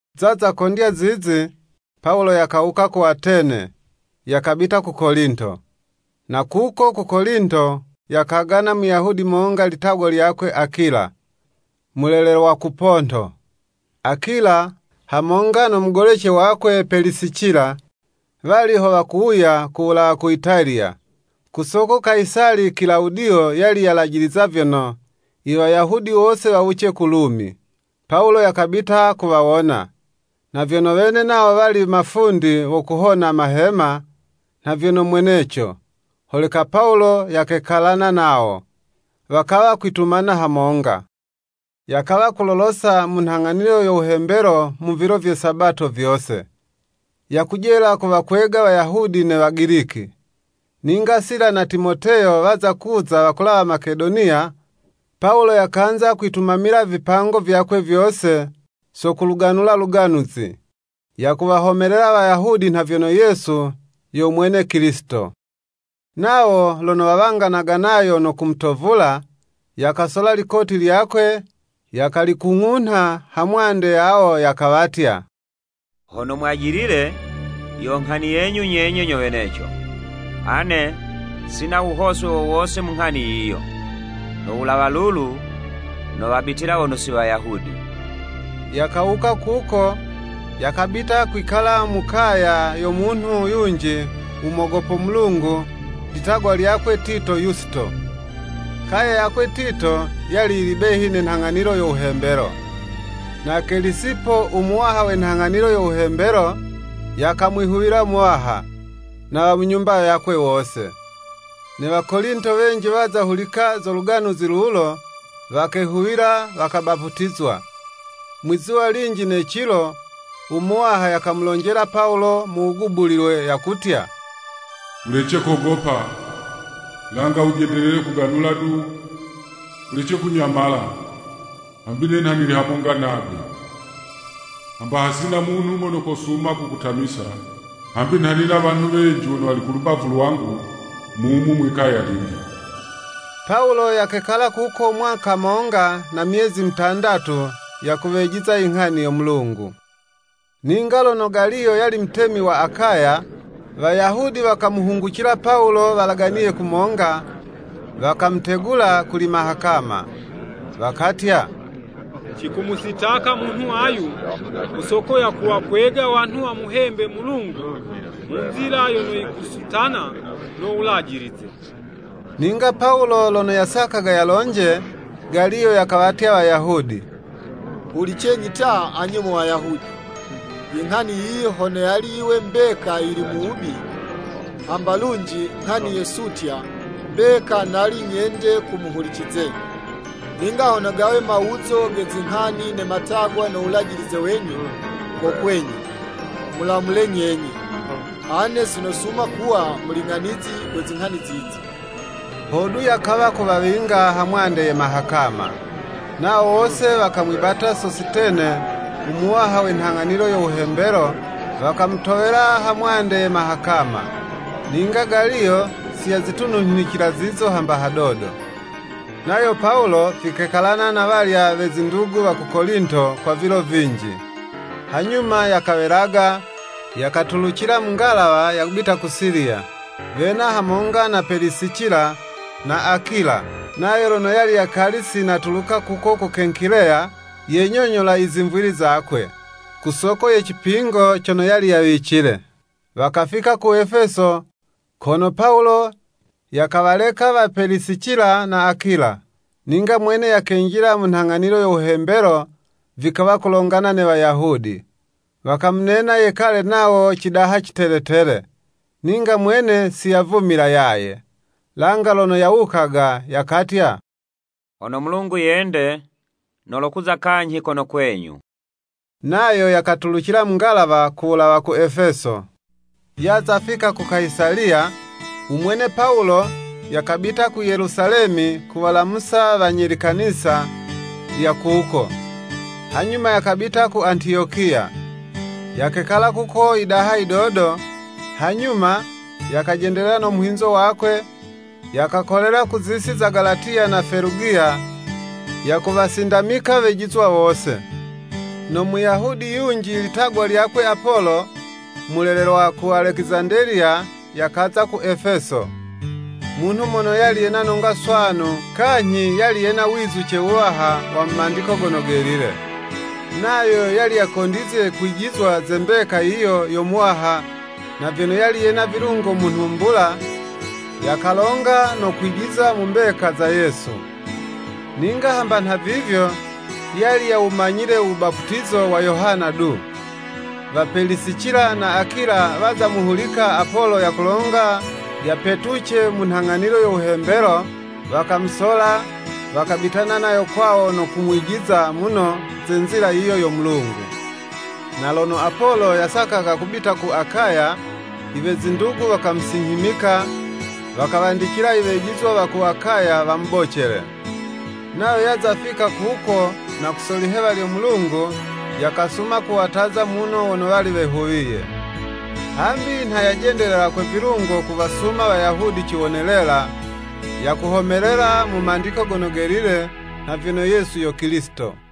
Zaza kukondya zizi, Pawulo yakawuka ku Atene, yakabita ku Kolinto. Na kuko ku Kolinto yakagana Muyahudi monga litagwa lyakwe Akila, mulelelwa ku Ponto. Akila, hamonga no mugolece wakwe Pelisicila, wali ho wakuwuya ku wulawa ku Italiya, ku soko Kayisali Kilawudiyo yali yalajiliza vyono, i Wayahudi wose wawuce ku Lumi. Pawulo yakabita kuwawona. Na vyono wene nawo wali mafundi wa kuhona mahema, nha vyono mweneco, holeka Pawulo yakekalana nawo, wakawa kwitumana hamonga. Yakawa kulolosa mu nghang'anilo yo wuhembelo mu vilo vye Sabato vyose, yakujela kuwakwega Wayahudi ne Wagiliki. Ninga Sila na Timoteyo waza kuza wakulawa Makedoniya, Pawulo yakanza kwitumamila vipango vyakwe vyose, so kuluganula Luganuzi, yakuwahomelela Wayahudi nha vyono Yesu yo mwene Kilisito. Nawo lono wawanganaga nayo no kumutovula, yakasola likoti lyakwe yakalikung'unha ha mwande yawo, yakawatya, “Hono mwajilile, yo nghani yenyu nyenye nyo weneco, ane sina wuhoswe wo wose mu nghani yiyo. No wulawa lulu, nowabitila wono si Wayahudi.” Yakawuka kuko, yakabita kwikala mu kaya yo munhu yunji u mogopo Mulungu, litagwa lyakwe, Tito Yusito. Kaya yakwe Tito yali yili behi ne nhang'anilo yo wuhembelo. Na Kelisipo u muwaha we nhang'anilo yo wuhembelo, yakamwihuwila Muwaha, na wa mu nyumba yakwe wose. Ne Wakolinto wenji waza hulika zo Luganuzi lulo, wakehuwila, wakabaputizwa. Mwi'zuwa linji ne cilo, u Muwaha yakamulonjela Pawulo mu wugubulilwe, yakutya, “Wulece kogopa, langa wujendelele kuganula du, wulece kunyamala, hambi ne nha nili hamonga nagwe. Hamba hasina munhu mono kosuma kukutamisa, hambi nha nina wanhu wenji wono wali ku lubavu lwangu, mumu mwikaya lili.” Pawulo yakekala kuko mwaka monga na myezi mutandatu, yakuwejiza inghani yo Mulungu. Ninga lono Galiyo yali mutemi wa Akaya, Wayahudi wakamuhungucila Pawulo walaganiye kumonga, wakamutegula kuli mahakama. Wakatya, “Cikumusitaka munhu ayu, ku soko yakuwakwega wanhu wamuhembe Mulungu mu nzila yono yikusutana no wulajilize.” Ninga Pawulo lono yasakaga yalonje, Galiyo yakawatya Wayahudi, “Hulicenyi ta anye mo Wayahudi! Inghani yiyi hono yali yiwe mbeka yili mu wubi, hamba lunji nghani ye sutya, mbeka nali nyende kumuhulicizenyi. Ninga hono gawe mawuzo ge zinghani ne matagwa no wulajilize wenyu, ko kwenyu, mulamule nyenye. Ane sinosuma kuwa muling'anizi we zinghani zizi.” Hodu yakawa kuwawinga ha mwande ye mahakama. Nawo wose wakamwibata Sositene, u muwaha we nhang'anilo yo wuhembelo, wakamutowela ha mwande ye mahakama. Ninga Galiyo si yazitununhicila zizo hamba hadodo. Nayo Pawulo, vikekalana na walya we zindugu wa ku Kolinto, kwa vilo vinji. Hanyuma yakawelaga, yakatulucila mu ngalawa yakubita ku Siliya, wena hamonga na Pelisicila na Akula. Nayo lono yali yakali si natuluka kuko ku Kenkileya, yenyonyola izimvwili zakwe, kusoko ye cipingo cono yali yawicile. Wakafika ku Efeso, kono Pawulo yakawaleka wa Pelisicila na Akula, ninga mwene yakenjila mu nhang'anilo yo wuhembelo vikawa kulongana ne Wayahudi. Wakamunena yekale nawo cidaha citeletele, ninga mwene siyavumila yaye. Langa lono yawukaga, yakatya, “Hono Mulungu yende nolokuza kanyhi kono kwenyu.” Nayo yakatulucila mu ngalawa ku wulawa ku Efeso. Yaza fika ku Kayisaliya, umwene Pawulo yakabita ku Yelusalemi kuwalamusa wanye likanisa lya kuko, hanyuma yakabita ku Antiyokiya. Yakekala kuko yidaha yidodo, hanyuma yakajendelela no muhinzo wakwe yakakolela ku zisi za Galatiya na Felugiya yakuwasindamika wejizwa wose. No Muyahudi yunji litagwa lyakwe Apolo mulelelwa ku Alekizandeliya, yakaza ku Efeso. Munhu mono yali yena nonga swanu kanyhi yali yena wizuce wuwaha wa mu Mandiko Gono Gelile. Nayo yali yakondizye kwijizwa ze mbeka yiyo yo Muwaha, na vyono yali yena vilungo mu nhumbula, yakalonga no kwijiza mu mbeka, za Yesu. Ninga hamba nhavivyo, yali yawumanyile u wubaputizo wa Yohana du. Wa Pelisicila na Akila waza muhulika Apolo yakulonga yapetuce mu nhang'anilo yo wuhembelo, wakamusola, wakabitana nayo kwawo no kumwijiza muno ze nzila yiyo yo Mulungu. Na lono Apolo yasakaga kubita ku Akaya, iwe zindugu wakamusinyhimika, wakawandicila iwejizwa wa ku Akaya wamubocele. Nayo yaza fika kuko na ku so lihewa lyo Mulungu, yakasuma kuwataza muno wono wali wehuwiye. Hambi nha yajendelela kwe vilungo kuwasuma Wayahudi ciwonelela, yakuhomelela mu Mandiko Gono Gelile nha vyono Yesu yo Kilisito.